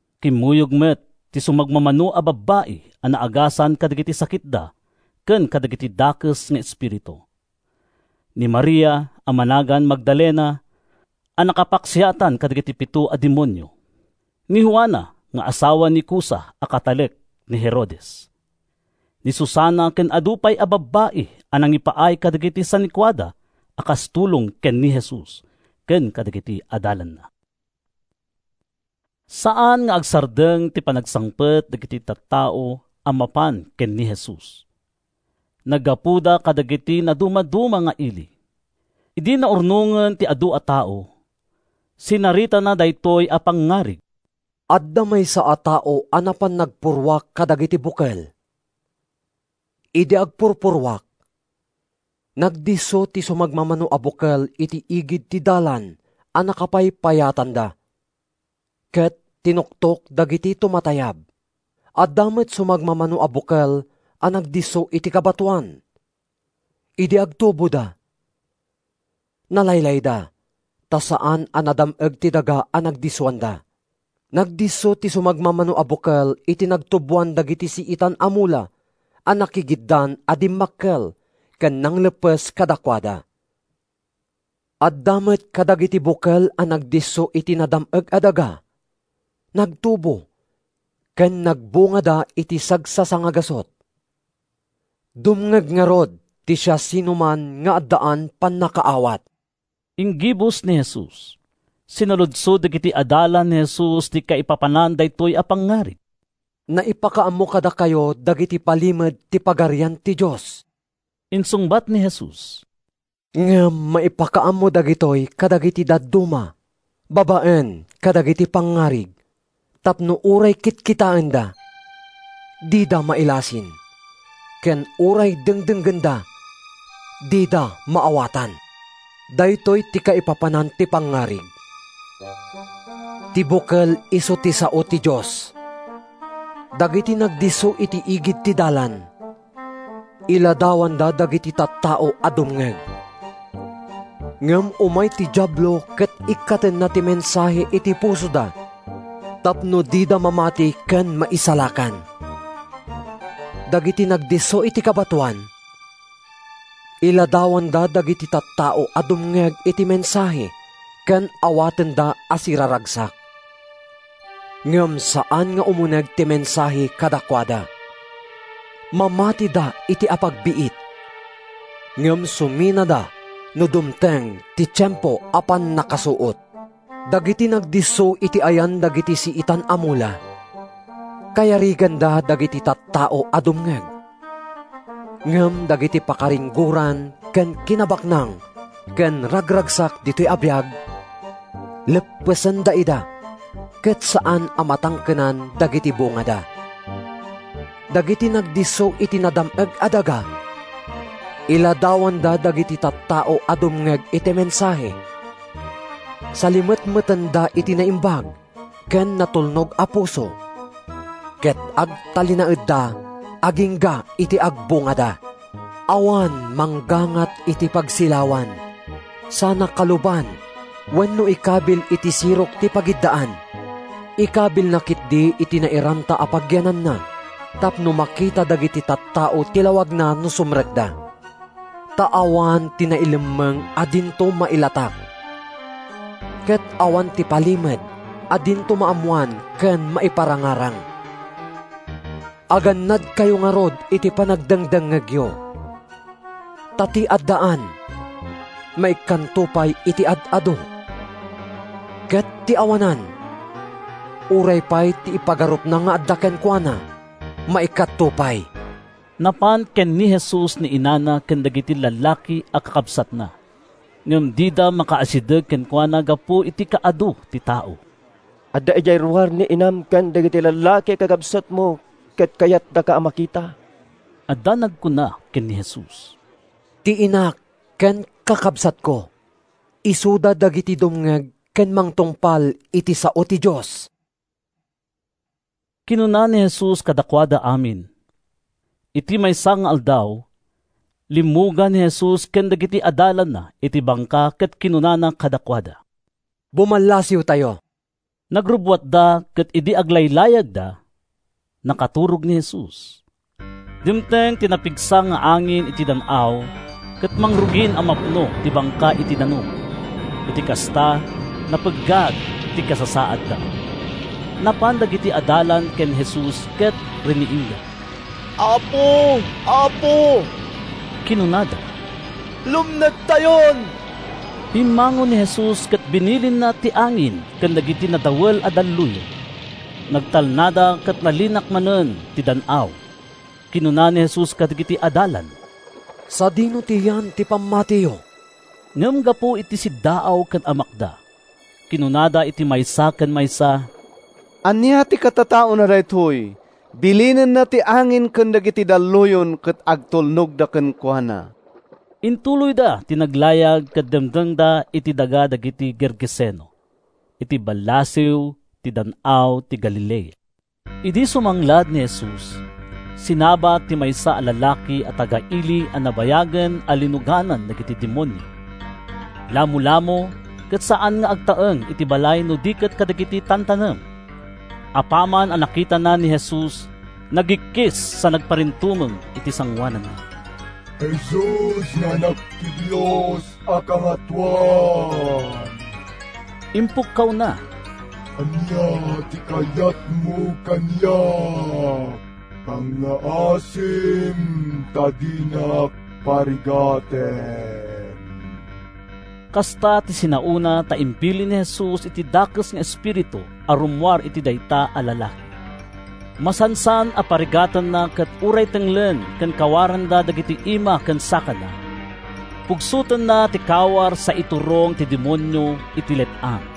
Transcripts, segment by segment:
Kimmuyog met ti sumagmamano a babbai a naagasan kadagiti sakitda ken kadagiti dakes nga espiritu: ni Maria a managan Magdalena a nakapaksiatan kadagiti pito a demonio, ni Juana nga asawa ni Cusa a katalek ni Herodes, ni Susana ken adu pay a babbai a nangipaay kadagiti sanikuada a kas tulong ken ni Jesus ken kadagiti adalanna. Saan nga agsardeng ti panagsangpet dagiti tattao a mapan ken ni Jesus. Naggapuda kadagiti nadumaduma nga ili. Idi naurnongen ti adu a tao, sinaritana daytoy a pangngarig: “Adda maysa a tao a napan nagpurruak kadagiti bukel. Idi agpurpurruak, nagdisso ti sumagmamano a bukel iti igid ti dalan a nakapaypayatanda ket tinuktok dagiti tumatayab. Adda met sumagmamano a bukel a nagdisso iti kabatoan. Idi agtuboda, nalaylayda ta saan a nadam-eg ti daga a nagdissoanda. Nagdisso ti sumagmamano a bukel iti nagtuboan dagiti siitan a mula a nakigiddan a dimmakkel ken nangleppes kadakuada. Adda met kadagiti bukel a nagdisso iti nadam-eg a daga, nagtubo ken nagbungada iti sagsasangagasut. “Dumngeg ngarud ti siasinoman nga addaan pannakaawat,” inggibus ni Jesus. Sinaludsod dagiti adalan ni Jesus ti kaipapanan daytoy a pangngarig. “Naipakaammo kadakayo dagiti palimed ti Pagarian ti Dios,” insungbat ni Jesus. “Ngem maipakaammo dagitoy kadagiti dadduma babaen kadagiti pangngarig, tapno ‘uray kitkitaenda, dida mailasin, ken uray dengdenggenda, dida maawatan.’” “Daytoy ti kaipapanan ti pangngarig: Ti bukel isu ti sao ti Dios. Dagiti nagdisso iti igid ti dalan, iladawanda dagiti tattao a dumngeg. Ngem umay ti Diablo ket ikkatenna ti mensahe iti pusoda tapno dida mamati ken maisalakan. Dagiti nagdisso iti kabatoan, iladawanda dagiti tattao a dumngeg iti mensahe ken awatenda a siraragsak. Ngem saan nga umuneg ti mensahe kadakuada. Mamatida iti apagbiit, ngem suminada no dumteng ti tiempo a pannakasuot. Dagiti nagdisso iti ayan dagiti siitan a mula, kayariganda dagiti tattao a dumngeg; ngem dagiti pakaringgoran ken kinabaknang ken ragragsak ditoy a biag, leppesenda ida ket saan a matangkenan dagiti bungada. Dagiti nagdisso iti nadam-eg a daga, iladawanda dagiti tattao a dumngeg iti mensahe, salimetmetanda iti naimbag ken natulnog a puso, ket agtalinaedda agingga iti agbungada.” “Awan manggangat iti pagsilawan sana kaluban wenno ikabil iti sirok ti pagiddaan. Ikabilna ketdi iti nairanta a pagyananna tapno makita dagiti tattao ti lawagna no sumrekda. Ta awan ti nailemmeng a dinto mailatak, ket awan ti palimed a dinto maammoan ken maiparangarang. “Agannadkayo ngarud iti panagdengngegyo. Ta ti addaan, maikkanto pay iti ad-adu, ket ti awanan, uray pay ti ipagarupna nga adda kenkuana maikkatto pay.” Napan ken ni Jesus ni inana ken dagiti lallaki a kakabsatna, ngem dida makaasideg kenkuana gapu iti kaadu ti tao. “Adda idiay ruar ni inam ken dagiti lallaki a kakabsatmo, ket kayatdaka a makita,” adda nagkuna ken ni Jesus. “Ti inak ken kakabsatko, isuda dagiti dumngeg ken mangtungpal iti sao ti Dios,” kinuna ni Jesus kadakuada amin. Iti maysa nga aldaw, limmugan ni Jesus ken dagiti adalanna iti bangka ket kinunana kadakuada, “Bumallasiwtayo.” Nagrubbuatda ket idi aglaylayagda, nakaturog ni Jesus. Dimteng ti napigsa nga angin iti dan-aw ket mangrugin a mapno ti bangka iti danum. Iti kasta, napeggad ti kasasaadda. Napan dagiti adalan ken ni Jesus ket riniingda. “Apo! Apo!” kinunada, “lumnedtayon.” Bimmangon ni Jesus ket binilinna ti angin ken dagiti nadawel a dalluyon. Nagtalnada ket nalinak manen ti dan-aw. Kinuna ni Jesus kadagiti adalan, “Sadino ti yan ti pammatiyo?” Ngem gapu iti siddaaw ken amakda, kinunada iti maysa ken maysa: “Ania ti katataona daytoy? Bilinenna ti angin ken dagiti dalluyon, ket agtulnogda kenkuana!” Intuloyda ti naglayag ket dimtengda iti daga dagiti Gergeseno, iti ballasiw ti Dan-aw ti Galilea. Idi sumanglad ni Jesus, sinabat ti maysa a lalaki a taga-ili a nabayagen a linuganan dagiti demonio. Lamolamo, ket saan nga agtaeng iti balay no di ket kadagiti tantanem. Apaman a nakitana ni Jesus, nagikkis sa nagparintumeng iti sangoananna. “Jesus nga Anak ti Dios a Kangatoan!” impukkawna. “Ania ti kayatmo kaniak? Pangngaasim ta dinak parigaten.” Kasta ti sinaona ta imbilin ni Jesus iti dakes nga espiritu a rummuar iti dayta a lalaki. Masansan a parigatenna ket uray tenglen ken kawaranda dagiti ima ken sakana, pugsotenna ti kawar sa iturong ti demonio iti let-ang.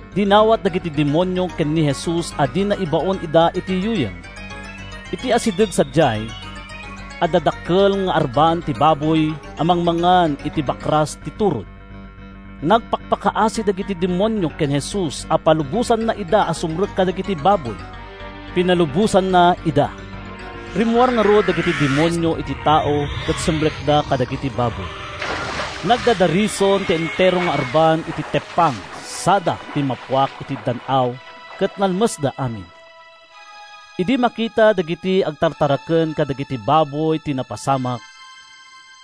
Dinawat dagiti demonio ken ni Jesus a dina ibaon ida iti yuyeng. Iti asideg sadiay, adda dakkel nga arban ti baboy a mangmangan iti bakras ti turod. Nagpakpakaasi dagiti demonio ken Jesus a palubosanna ida a sumrek kadagiti baboy. Pinalubosanna ida. Rimmuar ngarud dagiti demonio iti tao ket simrekda kadagiti baboy. Nagdadarison ti entero nga arban iti teppang, sada timmapuak iti dan-aw ket nalmesda amin. Idi makita dagiti agtartaraken kadagiti baboy ti napasamak,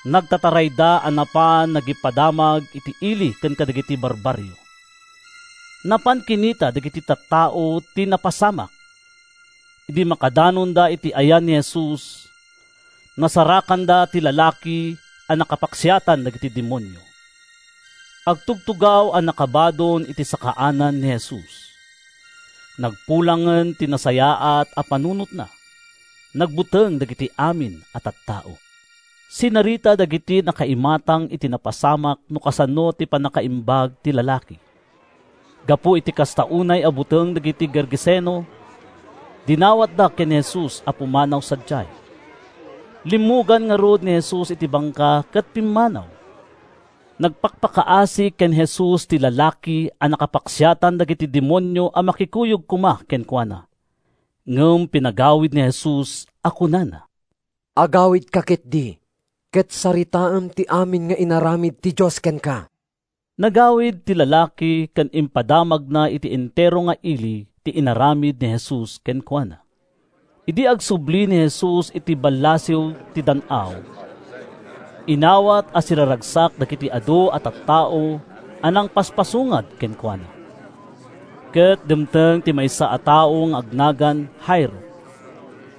nagtatarayda a napan nagipadamag iti ili ken kadagiti barbarrio. Napan kinita dagiti tattao ti napasamak. Idi makadanonda iti ayan ni Jesus, nasarakanda ti lalaki a nakapaksiatan dagiti demonio. Agtugtugaw a nakabadon iti sakaanan ni Jesus. Nagpulangen ti nasayaat a panunotna. Nagbuteng dagiti amin a tattao. Sinarita dagiti nakaimatang iti napasamak no kasano ti pannakapaimbag ti lalaki. Gapu iti kasta unay a buteng dagiti Gergeseno, dinawatda ken ni Jesus a pumanaw sadiay. Limmugan ngarud ni Jesus iti bangka ket pimmanaw. Nagpakpakaasi ken Jesus ti lalaki a nakapaksiatan dagiti demonio a makikuyog koma kenkuana. Ngem pinagawid ni Jesus a kunana: “Agawidka ketdi ket saritaem ti amin nga inaramid ti Dios kenka.” Nagawid ti lalaki ket impadamagna iti entero nga ili ti inaramid ni Jesus kenkuana. Idi agsubli ni Jesus iti ballasiw ti dan-aw, inawat a siraragsak dagiti adu a tattao a nangpaspasungad kenkuana. Ket dimteng ti maysa a tao nga agnagan Jairo,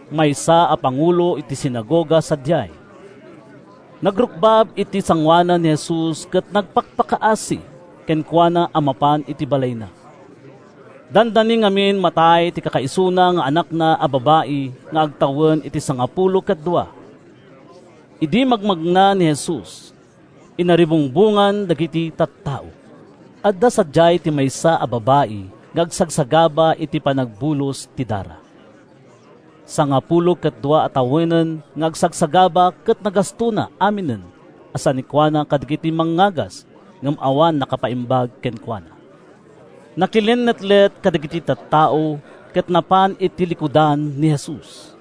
maysa a pangulo iti sinagoga sadiay. Nagrukbab iti sangoanan ni Jesus ket nagpakpakaasi kenkuana a mapan iti balayna. Dandani ngamin matay ti kakaisuna nga anakna a babai nga agtawen iti sangapulo ket dua. Idi magmagna ni Jesus, inaribungbongan dagiti tattao. Adda sadiay ti maysa a babai nga agsagsagaba iti panagbulos ti dara. Sangapulo ket dua a tawenen nga agsagsagaba ket nagastona aminen a sanikuana kadagiti mangngagas ngem awan nakapaimbag kenkuana. Nakilinnetlet kadagiti tattao ket napan iti likudan ni Jesus.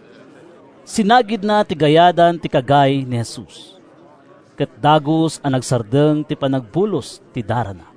Sinagidna ti gayadan ti kagay ni Jesus, ket dagus a nagsardeng ti panagbulos ti darana.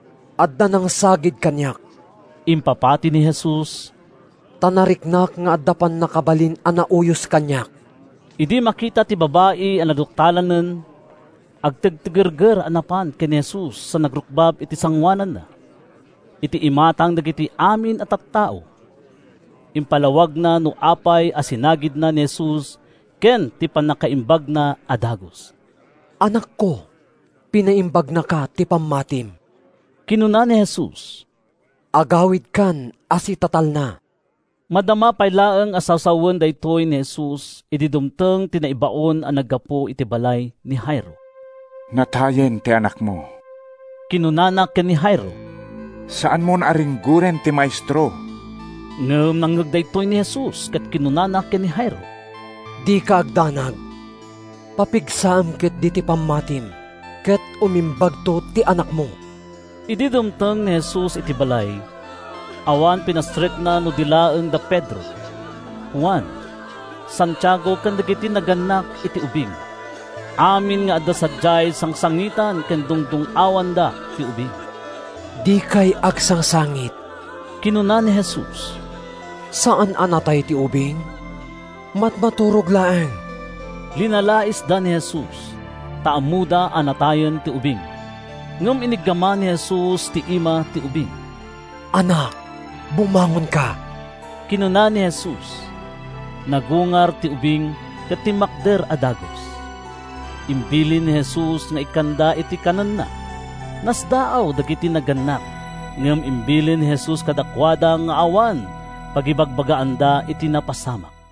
“Adda nangsagid kaniak,” impapati ni Jesus, “ta nariknak nga adda pannakabalin a nauyos kaniak.” Idi makita ti babai a naduktalanen, agtigtigerger a napan ken ni Jesus sa nagrukbab iti sangoananna. Iti imatang dagiti amin a tattao, impalawagna no apay a sinagidna ni Jesus ken ti pannakapaimbagna a dagus. “Anakko, pinaimbagnaka ti pammatim,” kinuna ni Jesus. “Agawidkan a sitatalna.” Madama pay laeng a sasawen daytoy ni Jesus idi dumteng ti naibaon a naggapu iti balay ni Jairo. “Natayen ti anakmo,” kinunana ken ni Jairo. “Saanmon a ringgoren ti Maestro.” Ngem nangngeg daytoy ni Jesus ket kinunana ken ni Jairo, “Dika agdanag. Papigsaem ketdi ti pammatim ket umimbagto ti anakmo.” Idi dumteng ni Jesus iti balay, awan pinastrekna no di laeng da Pedro, Juan, Santiago ken dagiti nagannak iti ubing. Amin nga adda sadiay sangsangitan ken dungdung-awanda ti ubing. “Dikay agsangsangit,” kinuna ni Jesus. “Saan a natay ti ubing—matmaturog laeng!” Linalaisda ni Jesus, ta ammoda a natayen ti ubing. Ngem iniggaman ni Jesus ti ima ti ubing. “Anak, bumangonka,” kinuna ni Jesus. Nagungar ti ubing ket timmakder a dagus. Imbilin ni Jesus nga ikkanda iti kanenna. Nasdaaw dagiti nagannak, ngem imbilin ni Jesus kadakuada nga awan pangibagbagaanda iti napasamak.